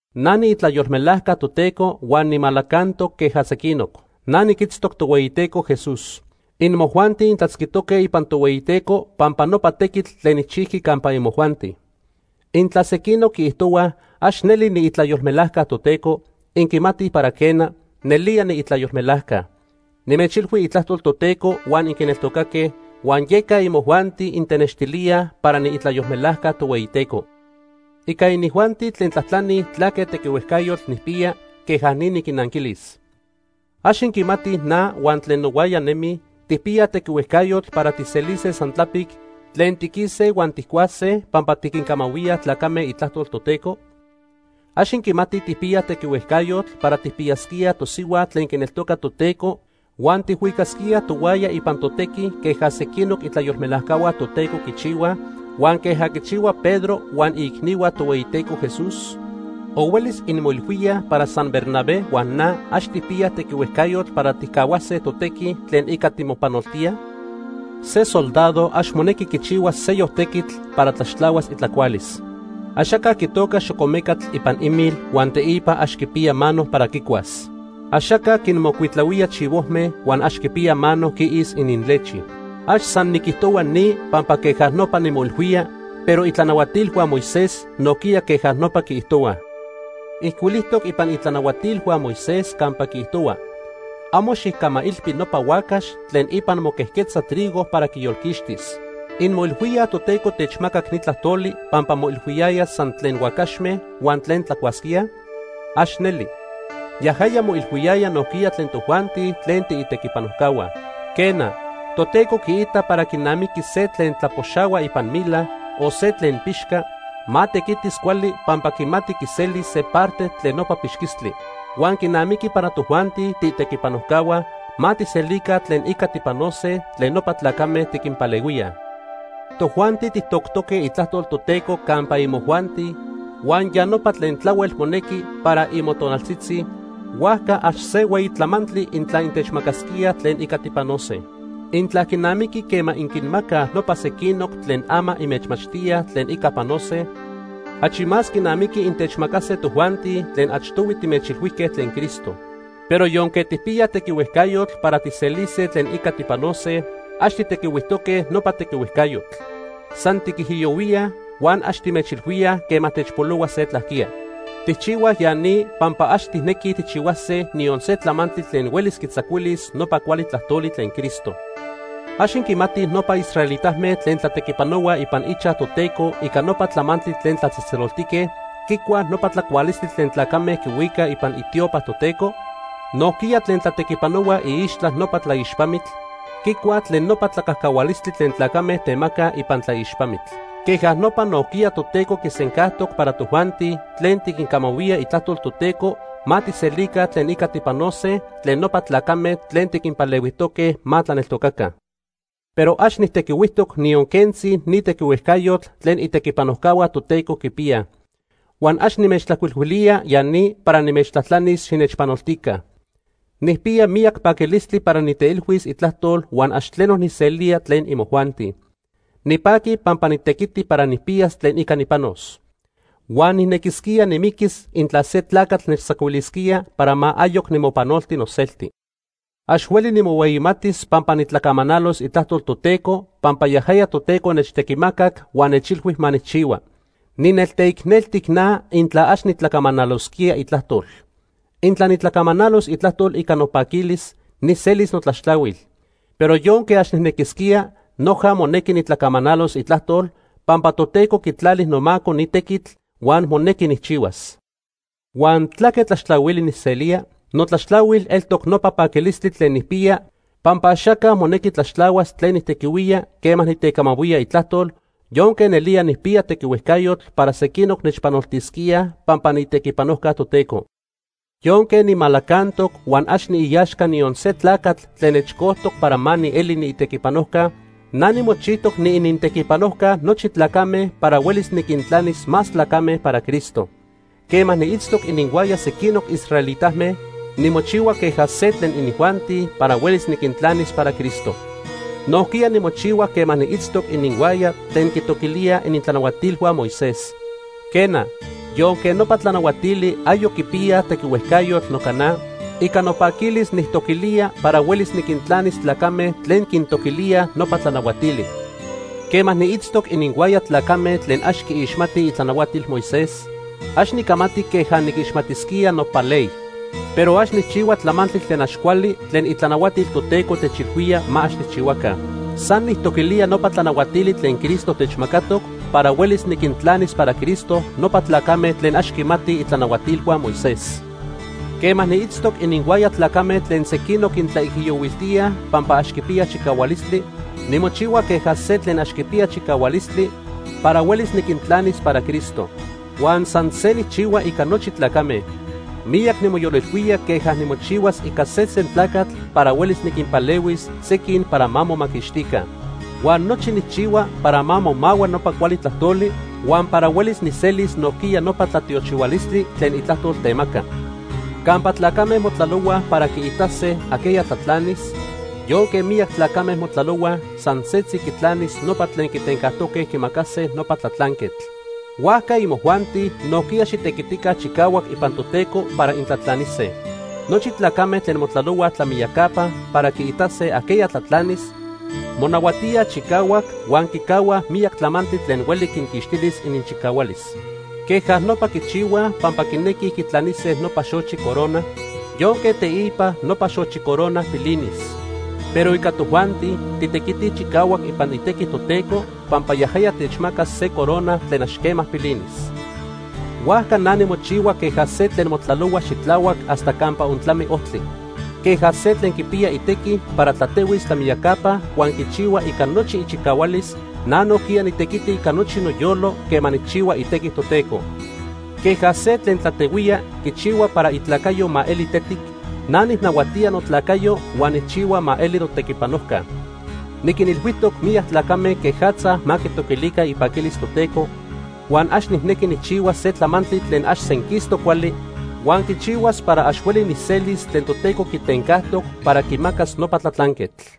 Na niitlayolmelajca Toteco huan nimalacantoc queja sequinoc. Na niquitztoc Tohueyiteco Jesús. Inmojuanti intlatzquijtoque ipan Tohueyiteco pampa nopa tequitl tlen nijchijqui campa imojuanti. Intla sequinoc quiijtohuaj ax neli niitlayolmelajca Toteco, inquimatij para quena, nelía niitlayolmelajca. Nimechilhui itlajtol Toteco huan inquineltocaque, huan yeca imojuanti intenextilíaj para niitlayolmelajca Tohueyiteco. Ica inijuanti tlen tlajtlani tlaque tequihuejcayotl nijpiya, queja ni niquinnanquilis. ¿Ax inquimatij na huan tlen nohuaya nemij tijpiyaj tequihuejcayotl para tijselise san tlapic tlen tiquise huan tijcuase pampa tiquincamahuía tlacame itlajtol Toteco? ¿Ax inquimatij tijpiyaj tequihuejcayotl para tijpiyasquíaj tosihua tlen quineltoca Toteco huan tijhuicasquíaj tohuaya ipan totequi queja sequinoc itlayolmelajcahua Toteco quichihuaj, huan queja quichihua Pedro huan iicnihua Tohueyiteco Jesús? ¿O huelis inmoilhuíaj para san Bernabé huan na ax tijpiyaj tequihuejcayotl para tijcahuase totequi tlen ica timopanoltíaj? Se soldado ax monequi quichihuas seyoc tequitl para tlaxtlahuas itlacualis. Axaca quitoca xocomecatl ipan imil huan teipa ax quipiya mano para quicuas. Axaca quinmocuitlahuía chivojme huan ax quipiyaj mano quiis ininlechi. Ax san niquijtohua ni pampa queja nopa nimoilhuía, pero itlanahuatilhua Moisés nojquiya queja nopa quiijtohuaj. Ijcuilijtoc ipan itlanahuatilhua Moisés campa quiijtohua: “Amo xijcamailpi nopa huacax tlen ipan moquejquetza trigo para quiyolquixtis.” ¿Inmoilhuíaj Toteco techmacac ni tlajtoli pampa moilhuiyaya san tlen huacaxme huan tlen tlacuasquíaj? ¡Ax neli! Yajaya moilhuiyaya nojquiya tlen tojuanti tlen tiitequipanojcahua. Quena, Toteco quiita para quinamiqui se tlen tlapoxahua ipan mila, o se tlen pixca, ma tequitis cuali pampa quimati quiselis se parte tlen nopa pixquistli. Huan quinamiqui para tojuanti tiitequipanojcahua, ma tijselica tlen ica tipanose tlen nopa tlacame tiquinpalehuíaj. Tojuanti tijtoctoque itlajtol Toteco campa imojuanti huan ya nopa tlen tlahuel monequi para imotonaltzitzi, huajca ax se hueyi tlamantli intla intechmacasquíaj tlen ica tipanose. Intla quinamiqui quema inquinmacaj nopa sequinoc tlen ama inmechmachtíaj tlen ica panose, achi más quinamiqui intechmacase tojuanti tlen achtohui timechilhuijque tlen Cristo. Pero yonque tijpiyaj tequihuejcayotl para tijselise tlen ica tipanose, ax tijtequihuijtoque nopa tequihuejcayotl. San tiquijiyohuíaj, huan ax timechilhuíaj quema techpolohua se tlajquiya. Tijchihuaj ya ni pampa ax tijnequij tijchihuase niyon se tlamantli tlen huelis quitzacuilis nopa cuali tlajtoli tlen Cristo. ¿Ax inquimatij nopa israelitame tlen tlatequipanohuaj ipan ichaj Toteco ica nopa tlamantli tlen tlatzejtzeloltique, quicuaj nopa tlacualistli tlen tlacame quihuicaj ipan itiopa Toteco? Nojquiya tlen tlatequipanohuaj iixtla nopa tlaixpamitl, quicuaj tlen nopa tlacajcahualistli tlen tlacame temacaj ipan tlaixpamitl. Queja nopa nojquiya Toteco quisencajtoc para tojuanti tlen tiquincamahuía itlajtol Toteco ma tijselica tlen ica tipanose tlen nopa tlacame tlen tiquinpalehuijtoque ma tlaneltocaca. Pero ax nijtequihuijtoc niyon quentzi ni tequihuejcayotl tlen itequipanojcahua Toteco quipiyaj. Huan ax nimechtlajcuilhuilía ya ni para nimechtlajtlanis xinechpanoltica. Nijpiya miyac paquilistli para niteilhuis itlajtol huan ax tleno nijselía tlen imojuanti. Nipaqui pampa nitequiti para nijpiyas tlen ica nipanos. Huan nijnequisquía nimiquis intla se tlacatl nechtzacuilisquía para ma ayoc nimopanolti noselti. Ax hueli nimohueyimatis pampa nitlacamanalos itlajtol Toteco pampa yajaya Toteco nechtequimacac huan nechilhui ma nijchihua. Ninelteicneltic na intla ax nitlacamanalosquía itlajtol. Intla nitlacamanalos itlajtol ica nopaquilis, nijselis notlaxtlahuil. Pero yonque ax nijnequisquía, noja monequi nitlacamanalos itlajtol, pampa Toteco quitlali nomaco ni tequitl huan monequi nijchihuas. Huan ¿tlaque tlaxtlahuili nijselía? Notlaxtlahuil eltoc nopa paquilistli tlen nijpiya pampa axaca monequi tlaxtlahuas tlen nijtequihuía quema nitecamahuía itlajtol, yonque nelía nijpiya tequihuejcayotl para sequinoc nechpanoltisquíaj pampa niitequipanojca Toteco. Yonque nimalacantoc huan ax niiaxca niyon se tlacatl tlen nechcojtoc para ma nieli niitequipanojca, na nimochijtoc niinintequipanojca nochi tlacame para huelis niquintlanis más tlacame para Cristo. Quema niitztoc ininhuaya sequinoc israelitame, nimochihua queja se tlen inijuanti para huelis niquintlanis para Cristo. Nojquiya nimochihua quema niitztoc ininhuaya tlen quintoquilíaj itlanahuatilhua Moisés. Quena, yonque nopa tlanahuatili ayoc quipiyaj tequihuejcayotl noca na, ica nopaquilis nijtoquilía para huelis niquintlanis tlacame tlen quintoquilíaj nopa tlanahuatili. Quema niitztoc ininhuaya tlacame tlen ax quiixmatij itlanahuatil Moisés, ax nicamati queja niquixmatisquía nopa ley. Pero ax nijchihua tlamantli tlen ax cuali tlen itlanahuatil Toteco techilhuíaj ma ax tijchihuaca. San nijtoquilía nopa tlanahuatili tlen Cristo techmacatoc para huelis niquintlanis para Cristo nopa tlacame tlen ax quimatij itlanahuatilhua Moisés. Quema niitztoc ininhuaya tlacame tlen sequinoc quintlaijiyohuiltíaj pampa ax quipiyaj chicahualistli, nimochihua queja se tlen ax quipiya chicahualistli para huelis niquintlanis para Cristo. Huan san se nijchihua ica nochi tlacame. Miyac nimoyolilhuía queja nimochihuas ica sesen tlacatl para huelis niquinpalehuis sequin para ma momaquixtica. Huan nochi nijchihua para ma momahua nopa cuali tlajtoli, huan para huelis nijselis nojquiya nopa tlatiochihualistli tlen itlajtol temaca. Campa tlacame motlalohuaj para quiitase ajqueya tlatlanis, yonque miyac tlacame motlalohuaj, san setzi quitlanis nopa tlen quitencajtoque quimacase nopa tlatlanquetl. Huajca imojuanti nojquiya xitequitica chicahuac ipan Toteco para intlatlanise. Nochi tlacame tlen motlalohuaj tlamiyacapa para quiitase ajqueya tlatlanis, monahuatíaj chicahuac huan quicahuaj miyac tlamantli tlen hueli quinquixtilis ininchicahualis. Queja nopa quichihuaj pampa quinequij quitlanise nopa xochi corona yonque teipa nopa xochi corona pilinis. Pero ica tojuanti, titequitij chicahuac ipan itequi Toteco pampa yajaya techmacas se corona tlen ax quema pilinis. Huajca na nimochihua queja se tlen motlalohua xitlahuac hasta campa ontlami ojtli. Queja se tlen quipiya itequi para tlatehuis tlamiyacapa huan quichihua ica nochi ichicahualis, na nojquiya nitequiti ica nochi noyolo quema nijchihua itequi Toteco. Queja se tlen tlatehuía quichihua para itlacayo ma eli tetic, na nijnahuatía notlacayo huan nijchihua ma eli notequipanojca. Niquinilhuijtoc miyac tlacame quejatza ma quitoquilica ipaquilis Toteco, huan ax nijnequi nijchihuas se tlamantli tlen ax senquistoc cuali huan quichihuas para ax hueli nijselis tlen Toteco quitencajtoc para quimacas nopa tlatlanquetl.